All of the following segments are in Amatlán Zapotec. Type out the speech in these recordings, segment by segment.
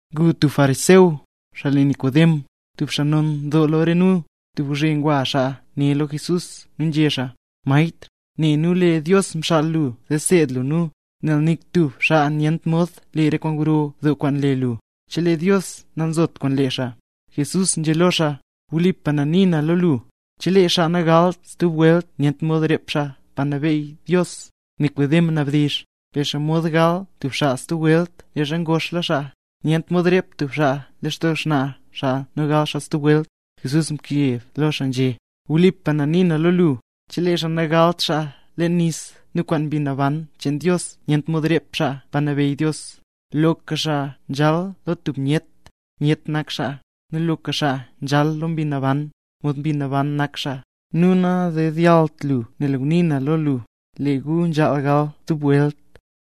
Ngu tub fariseo, xaa le Nikodem, tub xaa non doo lo re nu. Tub gwzhe ngwa xaa ne lo Jesús nu nzhé xaa: —Maestr, ne nu lee Dios mxaal lu zee seed lu nu, nel nik tub xaa nyent mod le re kwaan gro doo kwaan nle lu, chelee Dios nanzot kwaan lee xaa. Jesús nzhé lo xaa: —Wlipa na nii na lo lu, chelee xaa nagalt stub welt nyent mod rep xaa Pa Nabeyy Dios. Nikodem mnabdizh: —¿Per xomod gal tub xaa stub welt leezha ngoxla xaa? ¡Nyent mod rep tub xaa lextoo xnaa xaa nu gal xaa stub welt! Jesús mkeb lo xaa nzhé: —Wlipa na nii na lo lu, chelee xaa nagalt xaa leen nis nu kwaan Mbi Naban cheen Dios nyent mod rep xaa Pa Nabeyy Dios. Loka xaa nzhal lo tub myet, myet nak xaa; nu loka xaa nzhal lo Mbi Naban, mod Mbi Naban nak xaa. Nu nadedyallt lu nel ngunii na lo lu: Lee gu nzhaal gal stub welt.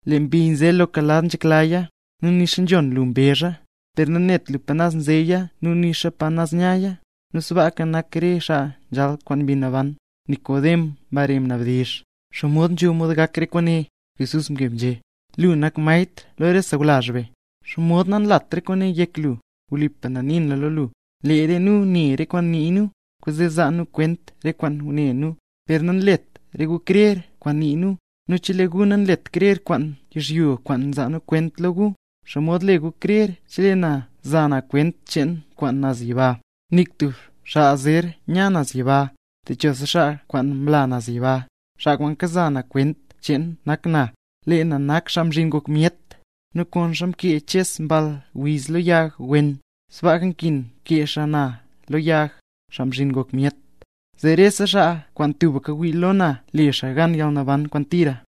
Lee mbi nze loka lad nzheklaya, nu nixa nzhon lu mbezha, per nanet lu pa naz nzeya nu nixa pa naz nyaya. Nu sbaaka nak re xaa nzhal kwaan Mbi Naban. Nikodem mbare mnabdizh: —¿Xomod nzho mod gak re kwaane? Jesús mkeb nzhé: —Lu nak maestr lo re sawlazh be, ¿xomod nanlat re kwaane yek lu? Wlipa na nii na lo lu, lee re nu ne re kwaan nii nu, kwaanzee nzaa nu kwent re kwaan ngune nu, per nanlet re gu krer kwaan nii nu. Nu chelee gu nanlet gu krer kwaan yizhyo kwaan nza kwent lo gu, ¿xomod le gu krer, chelee na za na kwent cheen kwaan naz yiba? ’Nik tub xaa zer ya naz yiba, techosa xaa kwaan mla naz yiba; xaa kwaan kaza na kwent cheen, nak na. Lee na nak Xaa Mzhin Ngok Myet. Nu konxa mkee Ches mball wiz lo yag wen, sbaaka nkin kee xaa na lo yag, Xaa Mzhin Ngok Myet, zee rese xaa kwaan tubka wii lo na, le xaa gan yalnaban kwaan tira.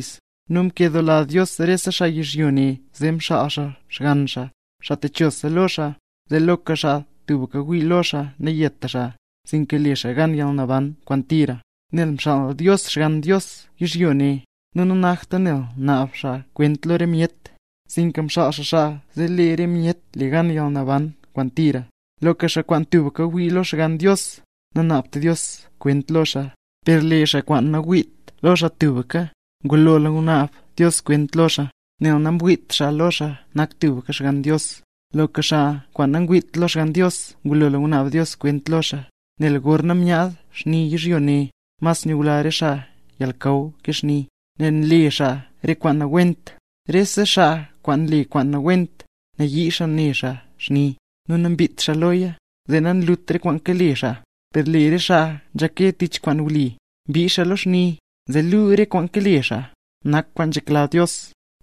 Nu mkedoola Dios rese xaa yizhyo ne, zee mxaal xaa Xgann xaa, xaa techosa lo xaa, zee loka xaa tubka wii lo xaa nayeta xaa, sinka le xaa gan yalnaban kwaan tira. Nel mxaal Dios Xgann Dios yizhyo ne, nu nanakta nel naab xaa kwent lo re myet, sinka mxaal xaa xaa zee lee re myet le gan yalnaban kwaan tira. Loka xaa kwaan tubka wii lo Xgann Dios, nanaabt Dios kwent lo xaa; per lee xaa kwaan nawiit lo xaa tubka, ngulola ngunaab Dios kwent lo xaa, nel namwiit xaa lo xaa nak tubka Xgann Dios. Loka xaa kwaan nangwiit lo Xgann Dios ngulola ngunaab Dios kwent lo xaa, nel gorna myaad xni yizhyo ne, mas nyula re xaa yalnakaw ke xni, nel nle xaa re kwaan nawent. Rese xaa kwaan nle kwaan nawent, nayii xaa ne xaa xni, nu nambiit xaa loya, zee nalut re kwaan kale xaa. Per lee re xaa nzhake tich kwaan wli, mbii xaa lo xni, zee luu lee re kwaan kale xaa, nak kwaan nzhekla Dios.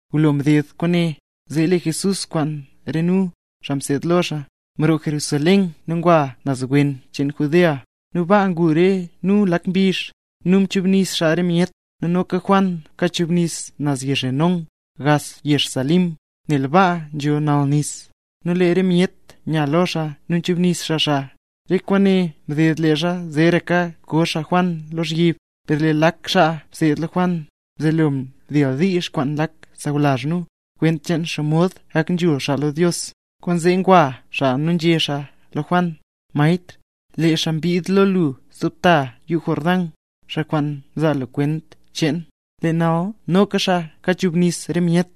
Ngulo mded kwaane, zee lee Jesús kwaan re nu, xaa mseed lo xaa, mroo Jerusalén nu ngwa nu naz wen cheen Judea, nu baa ngu re nu lak mbizh, nu mchubnis xaa re myet. Nu noka Juan kachubnis naz yezh Enón, gax yezh Salim, nel baa nzho nall nis; nu lee re myet nya lo xaa nu nchubnis xaa xaa. Re kwaane mded leezha zeeraka ko xaa Juan lozhyib. Per lee lak xaa mseed lo Juan, mzelo mdildiizh kwaan lak sawlazh nu, kwent cheen xomod gak nzhul xaa lo Dios, kwaanzee ngwa xaa nu nzhé xaa lo Juan: —Maestr, lee xaa mbid lo lu stub ta yuu Jordán, xaa kwaan mzaa lu kwent cheen, lee nal noka xaa kachubnis re myet,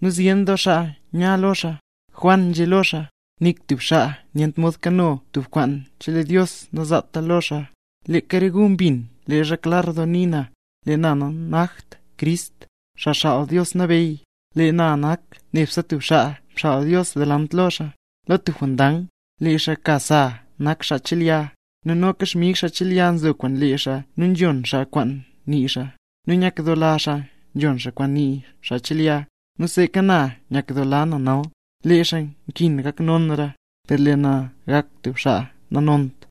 nu zyen doo xaa nya lo xaa. Juan nzhé lo xaa: —Nik tub xaa nyent mod kano tub kwaan chelee Dios nazaata lo xaa. Leeka re gu mbin leezha klar doo ngunii na, lee na nanakt Crist, xaa Xaal Dios Nabeyy, lee na nak nebse tub xaa mxaal Dios delant lo xaa. Lo tub jondang, lee xaa ka sa nak xaa chelya, nu noka xmig xaa nchelya nzo kwaan lee xaa, nu nzhon xaa kwaan nii xaa, nu nyakdoola xaa nzhon xaa kwaan nii xaa nchelya. Nu seeka na nyakdoola na nal. Lee xaa nkin gak nonra, per lee na gak tub xaa nanont.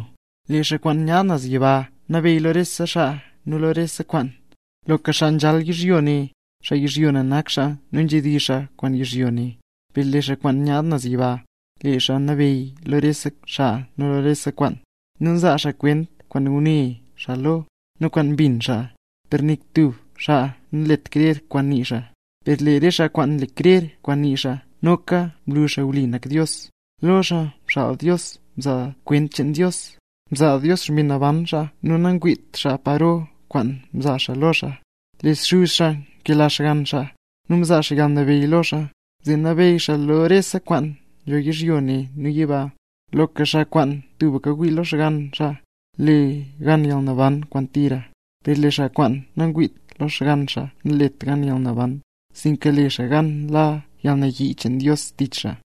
Lee xaa kwaan nyaad naz yiba nabeyy lo rese xaa nu lo rese kwaan. Loka xaa nzhal yizhyo ne, xaa yizhyo ne nak xaa nu nzhedizh xaa kwaan yizhyo ne. Per lee xaa kwaan nyaad naz yiba, lee xaa nabeyy lo rese xaa nu lo rese kwaan. Nu nzaa xaa kwent kwaan ngune xaa lo, nu kwaan mbin xaa, per nik tub xaa nanlet krer kwaan nii xaa. Per lee re xaa kwaan nle krer kwaan nii xaa noka mlu xaa wli nak Dios. Lo xaa mxaal Dios nzaa kwent cheen Dios, mzaa Dios Xmbi Naban xaa nu nangwiit xaa paro kwaan mzaa xaa lo xaa. Lee Xuz xaa nkela Xgann xaa, nu mzaa xaa yalnabeyy lo xaa, zee nabeyy xaa lo rese kwaan nzho yizhyo ne nu yiba. Loka xaa kwaan tubka wii lo Xgann xaa, le xaa gan yalnaban kwaan tira; per lee xaa kwaan nangwiit lo Xgann xaa nalet gan yalnaban, sinka le xaa gan la yalnayii cheen Dios tich xaa.